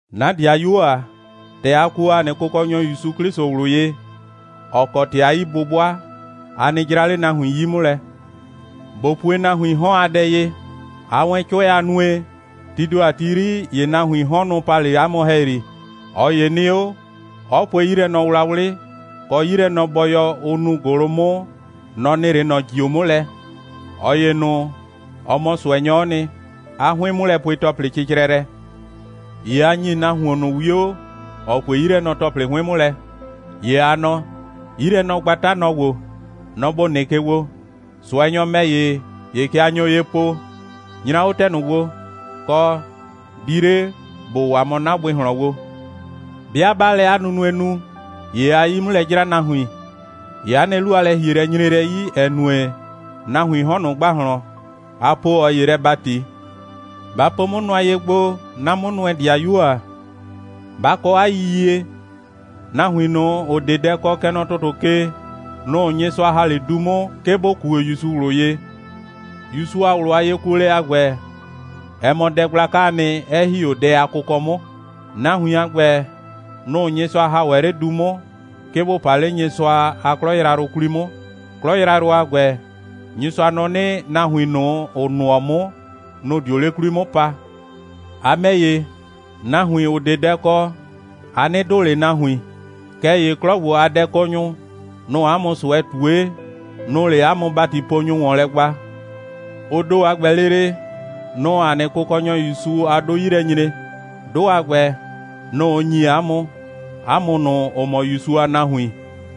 'Na ‑dɩayuo ‑a, ‑tɛ a kuo ‑a nɩ Kʋkɔnyɔ ‑Yusu 'Klɩsʋ ꞊wlʋ ye, ‑ɔ kɔ ‑tɩ a 'yi'bʋbʋa, a nɩ 'jra 'le nahuin 'yi 'mʋ lɛ. ꞊Bo pue nahuiin 'hɔn a dɛ ye: Aa wɛn 'cʋɛ a nue, tii ‑do a ti 'yri, ‑ye nahuiin 'hɔn, nʋ‑ pa 'le 'a mʋ ‑hɛyri. ꞊Ɔ ‑ye nɩ 'o, 'ɔ pue 'yilɛnɔwlawlɩ, kɔ 'yilɛnɔbɔyɔ, ʋ nuu ‑gʋlʋ 'mʋ, nɔ‑ nɩ 'le ꞊nɔ ‑jio 'mʋ lɛ. ꞊Ɔ ‑ye ꞊nʋ, ɔ mɔ ꞊sʋɛnyɔ'ɔ nɩ. 'A 'hʋɩn'mʋlɛpue‑tɔplɩ cɩcrɛ lɛ. ‑Ye a ‑nyi nahuon ꞊nʋ 'wio, ‑ɔ pue 'yilɛnɔ‑tɔplɩ 'hʋɩn 'mʋ lɛ, ‑ye a nɔ: «'Yilɛnɔgbata, nɔ‑ ‑gbo. Nɔ‑ ‑bo nɩ ke gbo.» ꞊Sʋɛnyɔ ‑mɛ ‑ye, ‑ye kɛ a nyo ye po: «Nyra 'o ‑tɛ ꞊nʋ gbo!» kɔ: «Di 'le, ‑bo waa mɔ 'na bʋɩ ꞊hlɔn gbo!» 'Bɩa 'baa lɛ 'a nunue nu, ‑ye aa 'yi 'mʋ lɛ 'jra nahuin, ‑ye 'a nɩ 'lu a lɛ‑hielɛ nyre lɛ 'yi, ‑ɛ nue, nahuiin 'hɔn ꞊nʋ ‑gbahlɔn, a poo ꞊ɔ ‑ye lɛ ‑bati. Ba po 'mʋ nʋa ye gbo, 'na 'mʋnʋɛ‑dɩayuo ‑a! Ba kɔ 'a yiyie, nahuin ꞊nʋ, ‑ʋ 'de dɛ kɔ, kɛ nɔ ‑tʋtʋ ke, nʋ‑ Nyɩsʋa ‑ha 'le du 'mʋ, 'ke bʋ kuo ‑Yusu ꞊wlʋ ye. ‑Yusu a ꞊wlʋ a yekuolɛ a ‑gbɛ, ɛ mɔ dɛ gblakaa nɩ, 'ɛ ‑hi 'o dɛ a kʋkɔ 'mʋ. Nahuin a ‑gbɛ, nʋ‑ Nyɩsʋa ‑ha ‑wɛ 'le du 'mʋ, 'ke bʋ pa 'le Nyɩsʋa a 'klɔ yrayrʋ 'kwli 'mʋ. 'Klɔ yrayrʋ a ‑gbɛ, Nyɩsʋa nɔ 'nɩ, nahuin ꞊nʋ, ‑ʋ nʋɔ 'mʋ, nʋ‑ dio 'le 'kwli 'mʋ pa. A ‑mɛ ‑ye, nahuin, ‑ʋ 'de dɛ kɔ, a 'nɩ dʋʋ ꞊le nahuin. Kɛɛ ‑ye 'klɔ ‑gbo a dɛkɔnyʋ, nʋ‑ʋ 'a mʋ ꞊sʋɛ ꞊tue, nʋ‑ʋ 'le 'a mʋ ‑batiponyʋ ‑wɔn lɛ gba. Ʋ ‑do a ‑gbɛ lele, nʋ‑ʋ ‑a nɩ Kʋkɔnyɔ ‑Yusu a 'dʋ 'yi lɛ nyre. 'Dʋ a ‑gbɛ, nʋ‑ ʋ ‑nyi 'a mʋ, 'a mʋ ꞊nʋ, ‑ʋ mɔ ‑Yusu a nahuin.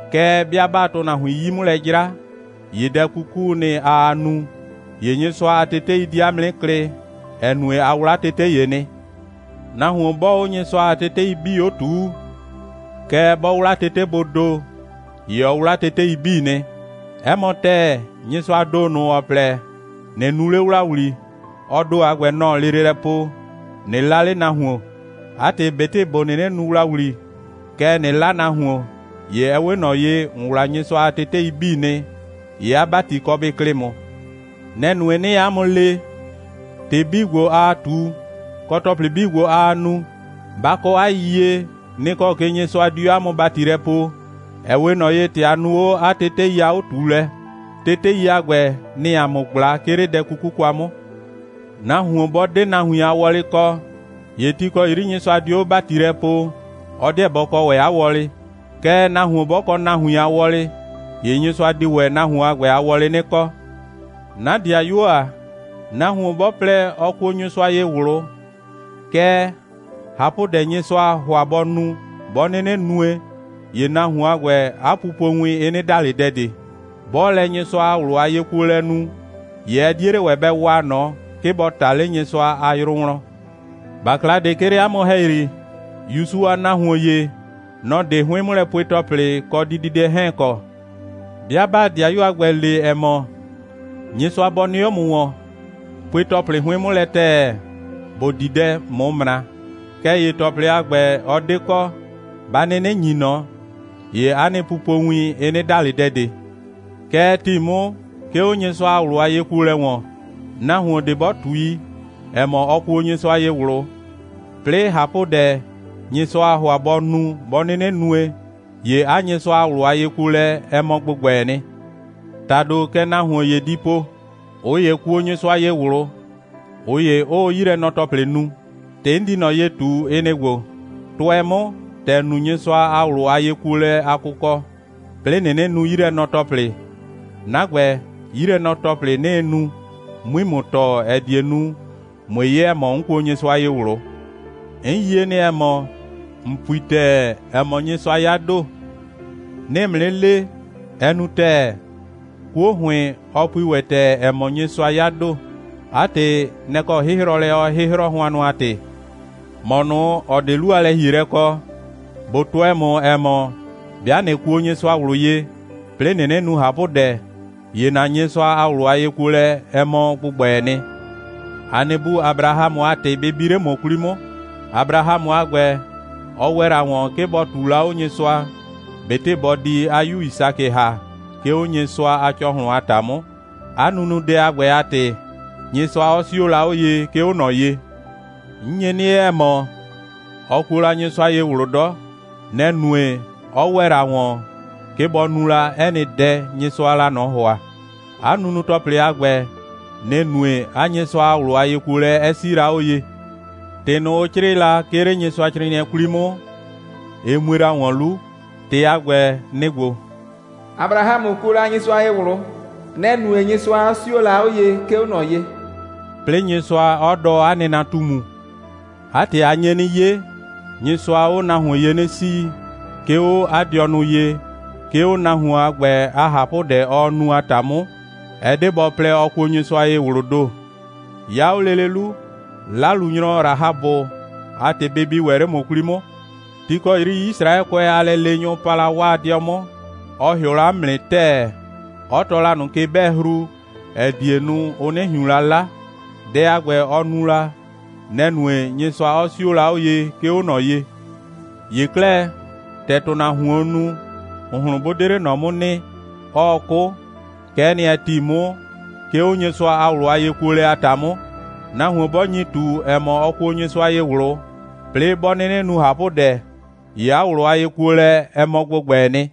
Kɛɛ, 'bɩa 'baa ‑tʋnahuin 'yi 'mʋ lɛ 'jra, ‑ye dɛ 'kukuu nɩ, aa nu, ‑ye Nyɩsʋa a tetei di 'a mʋ 'nɩ klɩ, ‑ɛ nue, a 'wla tete ‑ye nɩ. Nahuon 'bɔɔ 'o Nyɩsʋa a tetei 'bii 'o ꞊tuu, kɛɛ, 'bɔ 'wla tetebʋʋ ‑do, ‑ye ɔ 'wla tetei 'bii nɩ. 'Ɛ mɔ ‑tɛɛ, Nyɩsʋaa ‑do ꞊nʋ, ‑ɔ plɛ: ꞊Nɩ nu 'le ‑wlawli, ɔ ‑do a ‑gbɛ, nɔ‑ɔ lele lɛ po: ꞊Nɩ 'la 'le nahuon. 'A ‑tɩ ꞊betɩ ‑bo 'nɩnɩ nu ‑wlawli, kɛɛ, ꞊nɩ 'la nahuon, ‑ye ɛ 'we ꞊nɔ ye, ‑n 'wla Nyɩsʋa a tetei 'bii nɩ, ‑ye 'a ‑bati kɔ bɩ klɩ ‑mʋ. Nɛ‑ nue, 'nɩɩ 'a mʋ le: ‑Tɩ 'bii ‑gbo, aa ꞊tu, kɔ ‑tɔplɩ 'bii ‑gbo, aa nu, ba kɔ 'a yiyie, nɩ‑ kɔ ke Nyɩsʋa di 'o 'a mʋ ‑bati lɛ poo, ‑ɛ 'we ꞊nɔ ye, ‑tɛ a nu 'o 'a tetei a 'o꞊tuulɛ. Tetei a ‑gbɛ, nɩ‑ɩ ‑a mʋ ꞊gbla, 'ke 'le dɛ 'kuku kwa 'mʋ. Nahuon 'bɔ 'de nahuin a wɔlɩ kɔ, ‑ye ti ‑kɔ 'yri Nyɩsʋa dio 'o ‑bati lɛ poo, ɔ 'deɛ bɔ kɔ ‑wɛ 'a wɔlɩ. Kɛɛ, nahuon 'bɔ kɔ nahuin a wɔlɩ, ‑ye Nyɩsʋa di ‑wɛ nahuon a ‑gbɛ a wɔlɩ 'nɩ kɔ. 'Na ‑dɩayuo ‑a, nahuon 'bɔ plɛ, ɔ kuo Nyɩsʋa ye ꞊wlʋ, kɛɛ, ꞊hapʋdɛ, Nyɩsʋaa ‑hʋa bɔ nu, 'bɔ 'nɩnɩ nue, ‑ye nahuon a ‑gbɛ, 'a pupowin, ɩ 'nɩ da ꞊le dɛ ꞊de. 'Bɔɔ lɛ Nyɩsʋa a ꞊wlʋ a yekuolɛ nu, ‑ye ɛ 'die 'le ‑wɛ bɛ waa ꞊nɔ, 'ke bɔ ꞊ta 'le Nyɩsʋa a yrʋ wlɔn. ‑Bakla ꞊de, 'ke 'le 'a mʋ ‑hɛyri, ‑Yusu a nahuon ‑ye, nɔ‑ 'de 'hʋɩn'mʋlɛpue‑tɔplɩ kɔ dididɛ 'hɛɛn kɔ. 'Bɩa 'baa ‑dɩayu a ‑gbɛ le, ‑ɛ mɔ: «Nyɩsʋa bɔ nɩ 'o ‑mʋ ‑wɔn! Pue ‑tɔplɩ 'hʋɩn 'mʋ lɛ ‑tɛɛ, ‑bo di dɛ, ꞊mʋ ꞊mra!» Kɛɛ ‑ye ‑tɔplɩ a ‑gbɛ, ɔ 'de kɔ, 'ba 'nɩnɩ ‑nyi ꞊nɔ, ‑ye 'a nɩ pupowin, ɩ 'nɩ da ꞊le dɛ ꞊de. Kɛ ɛ ‑ti 'mʋ, 'ke 'o Nyɩsʋa a ꞊wlʋ a yekuolɛ ‑wɔn. Nahuon ꞊de 'bɔ ꞊tui, ‑ɛ mɔ, ɔ kuo Nyɩsʋa ye ꞊wlʋ, 'plɩɩ ꞊hapʋdɛ, Nyɩsʋaa ‑hʋa bɔ nu, 'bɔ 'nɩnɩ nue, ‑ye 'a Nyɩsʋa a ꞊wlʋ a yekuolɛ, ɛ mɔ ‑gbʋgbɛɛ nɩ. ‑Tado, kɛ nahuon ‑ye di po: «꞊Ʋ ‑ye kuo Nyɩsʋa ye ꞊wlʋ, ꞊ʋ ‑ye 'ʋʋ 'yilɛnɔ‑tɔplɩ nu.» ‑Tɩ 'n di ꞊nɔ ye ꞊tu, ɩ nɩ‑ ‑gbo: «Tʋɛ 'mʋ, ‑tɛ ‑n nu Nyɩsʋa a ꞊wlʋ a yekuolɛ a kʋkɔ, 'plɩɩ ꞊nɩnɩ nu 'yilɛnɔ‑tɔplɩ, 'na ‑gbɛ, 'yilɛnɔ‑tɔplɩ, 'nɩɩ nu, 'mui ‑mʋ tɔɔ, ‑ɛ die nu, ꞊mue 'ye, ‑ɛ mɔ, 'n kuo Nyɩsʋa ye ꞊wlʋ.» 'N yie nɩ, ‑ɛ mɔ, ‑n pui ‑tɛɛ, ‑ɛ mɔ, Nyɩsʋa 'ya ‑do. 'Nɩɩ ‑mʋ 'nɩ le: Ɛ nu ‑tɛɛ, 'kuo ‑hʋɩn, ɔ pui ‑wɛ ‑tɛɛ, ‑ɛ mɔ, Nyɩsʋa 'ya ‑do. 'A ‑tɩ, nɛ‑ kɔ 'hɩhrɔlɛ ɔɔ 'hɩhrɔ, hʋannʋ a ‑tɩ. ‑Mɔ ꞊nʋ, ‑ɔ 'de 'lu a lɛ‑hielɛ kɔ, ꞊bo tʋɛ ‑mʋ, ‑ɛ mɔ, 'bɩa ꞊nɩ kuo Nyɩsʋa ꞊wlʋ ye, 'plɩɩ ꞊nɩnɩ nu ꞊hapʋdɛ, ‑ye ‑na Nyɩsʋa a ꞊wlʋ a yekuolɛ, ɛ mɔ ‑gbʋgbɛɛ nɩ. ‑A nɩ bu Abrahamʋ a ‑tɩ bɩ bi 'le ‑mʋ 'kwli 'mʋ. Abrahamʋ a ‑gbɛ, ɔ ‑wɛ la ‑wɔn, 'ke bɔ ꞊tuu la 'o Nyɩsʋa, ꞊betɩ bɔ di 'a 'yu Yisakɩ ‑ha, 'ke 'o Nyɩsʋa a ‑cɔhlʋn a ‑ta 'mʋ. 'A nunudɛ a ‑gbɛ a ‑tɩ, Nyɩsʋa 'ɔ 'sio la 'o ye, 'ke 'o ꞊nɔ ye. ‑N nye 'nɩ 'ye, ‑ɛ mɔ, ɔ kuo la Nyɩsʋa ye ꞊wlʋ 'dɔ. Nɛ‑ nue, 'ɔ ‑wɛ la ‑wɔn, 'ke bɔ nu la 'ɛ nɩ dɛ, Nyɩsʋaa la ꞊nɔ ‑hʋa. 'A nunu‑tɔplɩ a ‑gbɛ, nɩ‑ nue, 'a Nyɩsʋa a ꞊wlʋ a yekuolɛ 'ɛ 'sii la 'o ye. ‑Tɩ ꞊nʋ, ʋ 'crɩɩ la, 'ke 'le Nyɩsʋacrɩɩnɩɛ 'kwli 'mʋ, ɩ mue la ‑wɔn 'lu. ‑Tɩ a ‑gbɛ, nɩ‑ ‑gbo: «Abrahamʋ kuo la Nyɩsʋa ye ꞊wlʋ. Nɛ‑ nue, Nyɩsʋa 'ɔ 'sio la 'o ye, 'ke 'o ꞊nɔ ye,» 'plɩɩ Nyɩsʋa 'ɔ dɔɔ 'a nɩnatumu. 'A ‑tɩ, a nye 'nɩ 'ye, Nyɩsʋaa 'o nahuon ye 'nɩ 'sii, 'ke 'o 'a dɩɔnʋ ye, 'ke 'o nahuon a ‑gbɛ a ꞊hapʋdɛ ɔɔ nu, a ‑ta 'mʋ, ɛ 'de bɔ plɛ, ɔ kuo Nyɩsʋa ye ꞊wlʋʋ ‑do. 'Ya 'o lele 'lu, 'lalunyrɔ Rahabʋ a ‑tɩ bɩ bi ‑wɛ 'le ‑mʋ 'kwli 'mʋ. Ti ‑kɔ 'yri Yisraɛkʋɛ a lɛleenyʋ pa la 'waa 'dɩɔ 'mʋ, ɔ ‑hɩʋ la 'mʋ nɩ ‑tɛɛ, 'ɔ tɔɔ la ꞊nʋ ke'bɛɛhru, ‑ɛ die nu, ʋ 'nɩ ꞊hiun la 'la. Dɛ a ‑gbɛ, ɔ nu la, nɛ‑ nue, Nyɩsʋa 'ɔ 'sio la 'o ye, 'ke 'o ꞊nɔ ye. ‑Ye 'klɛɛ, ‑tɛ ‑tʋnahuoon nu, ‑hʋnhlʋn 'bʋ 'de 'le ꞊nɔ 'mʋ nɩ, 'ɔɔ 'kʋ, kɛ'ɛ nɩ, ɛ ‑ti 'mʋ, 'ke 'o Nyɩsʋa a ꞊wlʋ a yekuolɛ a ‑ta 'mʋ. Nahuon 'bɔ nyi ꞊tu, ‑ɛ mɔ, ɔ kuo Nyɩsʋa ye ꞊wlʋ, 'plɩɩ 'bɔ 'nɩnɩ nu ꞊hapʋdɛ, ‑ye 'a ꞊wlʋ a yekuolɛ, ɛ mɔ ‑gbʋgbɛɛ nɩ.